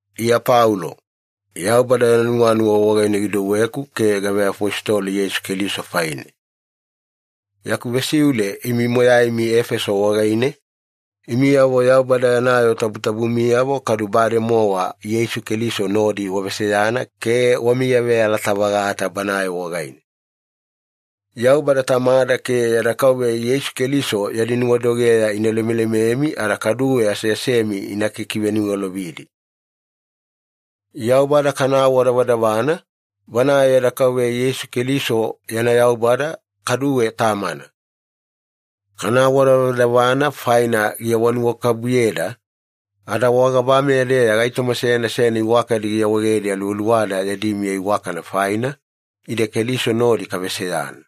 Iya Paulo. Yaubada yana nuwanuwa wagaine gidouweku ke gaveafositolo Yeisu Keliso faine. Yaku vesiule imi moyaimi Efeso wagaine, imiyavo Yaubada yana yoo tabutabumiyavo kadu bademowa Yeisu Keliso nodi waveseyana ke wamiyaveyalata-vagata Banae wagaine. Yaubada Tamada ke yada Kauveya Yeisu Keliso yadi nuwadogeya ina lemelememi ada kaduwe aseasemi ina kikiveniwalovidi. Yaubada kana awadavadavana, Banae yada Kauveya Yeisu Keliso yana Yaubada, kaduwe Tamana. Kana awadavadavana faina giawanuwakabubuyeda, ada wagabameya-deya gaitoma seyana seyana iwakadi giawaegedi aluwaluwada yadi miya iwakana faina, ide Keliso nodi kaveseyana.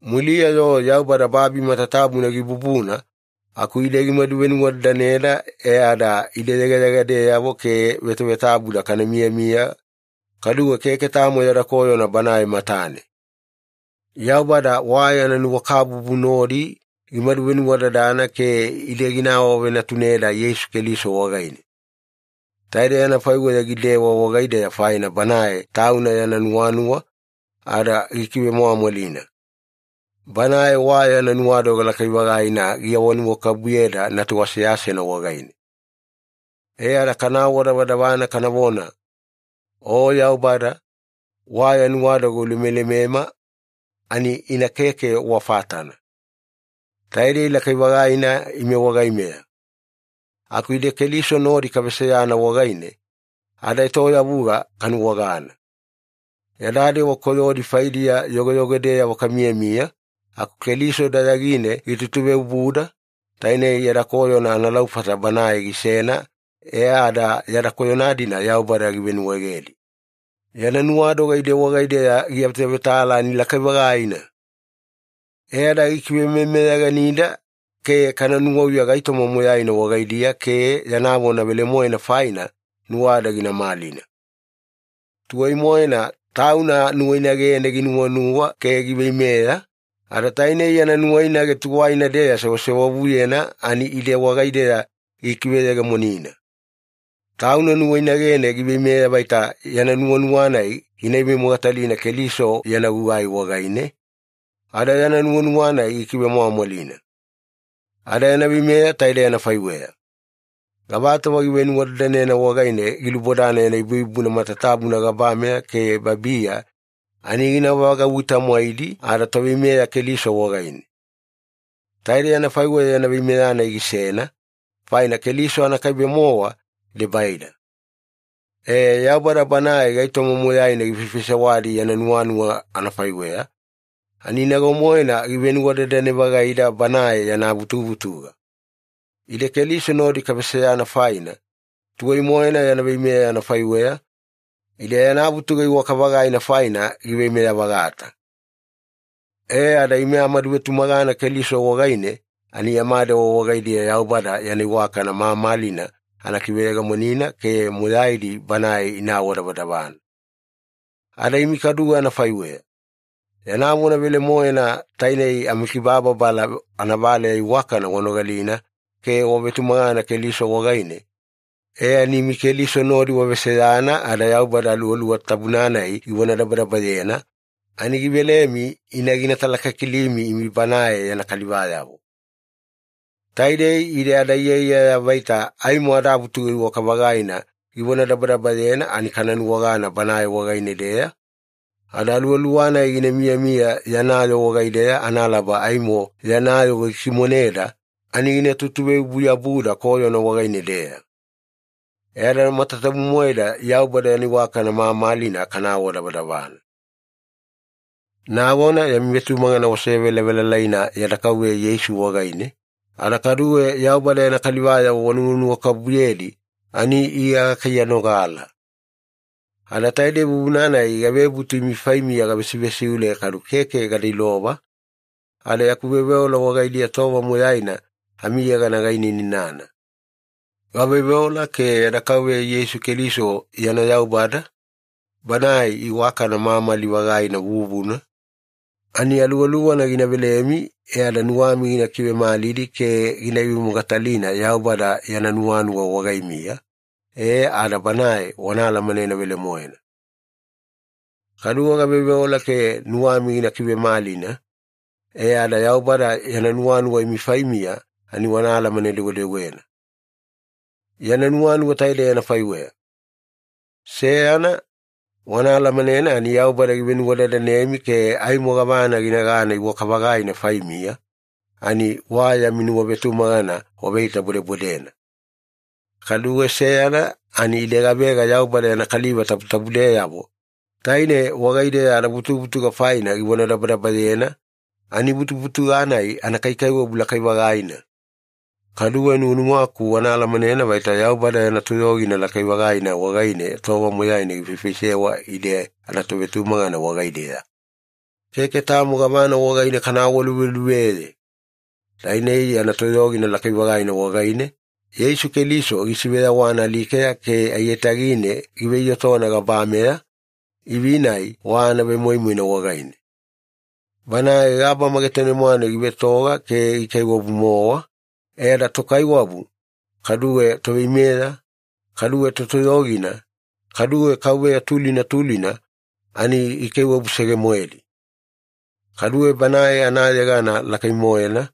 Muliya-yo Yaubada babi matatabuna gibubuna aku ide gimadu venuwadadaneda e ada ide yegayegadeyavo ke vetavetabuda kana miyamiya, kaduwe keke tamo yada koyona Banae matane. Yaubada wa yana nuwakabubu nodi gimadu venuwadadana ke ide gina awavenatuneda Yeisu Keliso wagaine. Taidei anafaiweya gidewa wagaideya faina Banae Tauna yana nuwanuwa, ada gikivemwamwalina. Banae wa yana nuwadoga lakai-vagaina giawanuwakabubuyeda Natu aseasena wagaine. E ada kana awadavadavana kanavona, “O Yaubada, wa ya nuwadoga ulemelemema, ani ina keke wa fatana. Taidei lakai-vagaina ime wagaimeya!” Aku ide Keliso nodi kaveseyana wagaine, adaetoyavuga kanuwagana. Yada dewa koyodi faidiya yogoyogodeyavo kamiyamiya aku Keliso dayagine gitutuveobuda, tainei yada koyona analaufata Banae gisena e ada yada koyona-dina Yaubada givenuwaegedi. Yana nuwadoga ide wagaideya giavetavetala ani lakai-vagaina! E ada gikivemeyameyaganida ke kana nuwauya gaitoma moyaina wagaidiya ke yana vona velemoena faina nuwada gina malina. Tuwai-moena Tauna nuwainagene ginuwanuwa ke giveimeya, ada tainei yana nuwainage tuwaina-deya sewasewavuyena ani ide wagaideya gikiveyegemonina. Tauna nuwainagene giveimeya vaita yana nuwanuwa-nai gina ivemogatalina Keliso yana gugai wagaine, ada yana nuwanuwa-nai gikivemwamwalina. Ada yana veimeya taidei anafaiweya. Gavatova givenuwadadanena wagaine gilubodana yana ibuibubuna matatabuna gabameya ke babiya ani gina vagauwi-tamwaidi adaToveimeya Keliso wagaine. Taidei anafaiweya yana veimeya-nai gisena, faina Keliso anakaibe-mowa debaida. E, Yaubada Banae gaitoma moyaina gifaifaisewadi yana nuwanuwa anafaiweya, ani nago-moena givenuwadadane-vagaida Banae yana vutuvutuga. Ide Keliso nodi kaveseyana faina, tuwai-moena yana veimeya anafaiweya, ide yana vutuga iwaka-vagaina faina giveimeya-vagata. E ada ime amaduvetumagana Keliso wagaine ani yama dewa wagaidiya Yaubada yana iwakana mamalina ana kiveyegemonina ke moyaidi Banae ina awadavadavana. Ada imi kaduwe anafaiweya. Yana vona velemoena, tainei amikibababala anavaleya iwakana wanogalina ke wavetumagana Keliso wagaine, e ani imi Keliso nodi waveseyana ada Yaubada Aluwaluwa Tabuna-nai givonadabadabayena, ani givelemi ina gitalakilimi imi Banae yana kalivayavo. Taidei ide adaiyaiyaya vaita aimo adavutuga iwaka-vagaina givonadabadabayena ani kana nuwagana Banae wagaine-deya, ada Aluwaluwa-nai gina miyamiya yana yoo wagaideya analaba aimo yana yoo gikimoneda, ani gina tutuveobu-yabuda koyona wagaine-deya. E ada matatabu-moeda Yaubada yana iwakana mamalina kana awadavadavana. Nagona yami vetumagana wasevelavelalaina yada Kauveya Yeisu wagaine, ada kaduwe Yaubada yana kalivayavo wanuwanuwakabubuyedi ani Iya gakaiyanogala. Ada taidei vuvuna-nai gavebutu imi faimiya gavesivesiule kadu keke gada ilova, ada yaku veoveola wagaidiya tova moyaina amiyegana gainainana. Gaveoveola ke yada Kauveya Yeisu Keliso yana Yaubada, Banae iwakana mamali-vagaina vuvuna, ani Aluwaluwana gina velemi e ada nuwami gina kivemalidi ke gina ivemogatalina Yaubada yana nuwanuwa wagaimiya, e ada Banae wana alamanena velemoena. Kaduwe gaveoveola ke nuwami gina kivemalina, e ada Yaubada yana nuwanuwa imi faimiya ani wana alamane-dewedewena. Yana nuwanuwa taidei anafaiweya. Seyana, wana alamanena ani Yaubada givenuwadadanemi ke aimo gavana ginagana iwaka-vagaina faimiya, ani wa yami nuwavetumagana waveitabodebodena. Kaduwe seyana ani ide gavega Yaubada yana kaliva tabutabudeyavo, taine wagaideya adavutuvutuga faina givonadabadabayena, ani vutuvutuga-nai anakaikaiwabu lakai-vagaina! Kaduwe nuwanuwaku wana alamanena vaita Yaubada yana toyogina lakai-vagaina wagaine tova moyaina gifaifaisewa ide anatovetumagana wagaideya. Keke tamo gavana wagaine kana awaluveluveye! Tainei yana toyogina lakai-vagaina wagaine, Yeisu Keliso gisiveyawana alikeya ke aiyatagine giveiyotona gabameya, ivi-nai wa anavemoimoina wagaine. Banae gabama getane-mwane givetoga ke gikaiwabu-mowa, e ada tokaiwabu, kaduwe toveimeya, kaduwe totoyogina, kaduwe kauveya tulina tulina ani gikaiwabusege-moedi. Kaduwe Banae anayegana lakai-moena,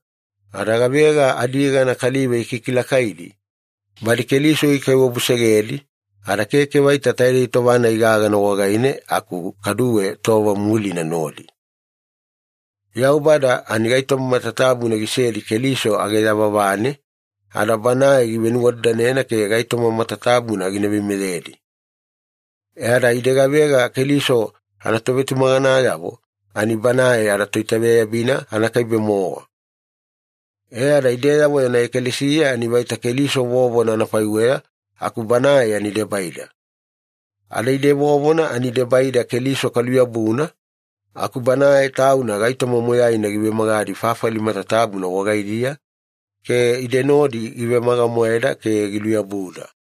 ada gavega adiyegana kaliva ikikilakaidi, badi Keliso gikaiwabusegedi, ada keke vaita taidei tova-nai gagana wagaine aku kaduwe tova mulina nodi. Yaubada ani gaitoma matatabuna gisedi Keliso age yavavane, ada Banae givenuwadadanena ke gaitoma matatabuna gina veimeyedi. E ada ide gavega Keliso anatovetumaganayavo ani Banae adaToitaveyabina anakaibe-mowa. E ada ideyavo yana ekalesiya ani vaita Keliso vovona anafaiweya aku Banae ani debaida. Ada ide vovona ani debaida Keliso kaluyabuna, aku Banae Tauna gaitoma moyaina givemagadi fafali matatabuna wagaidiya, ke ide nodi givemaga-moeda ke giluyabuda.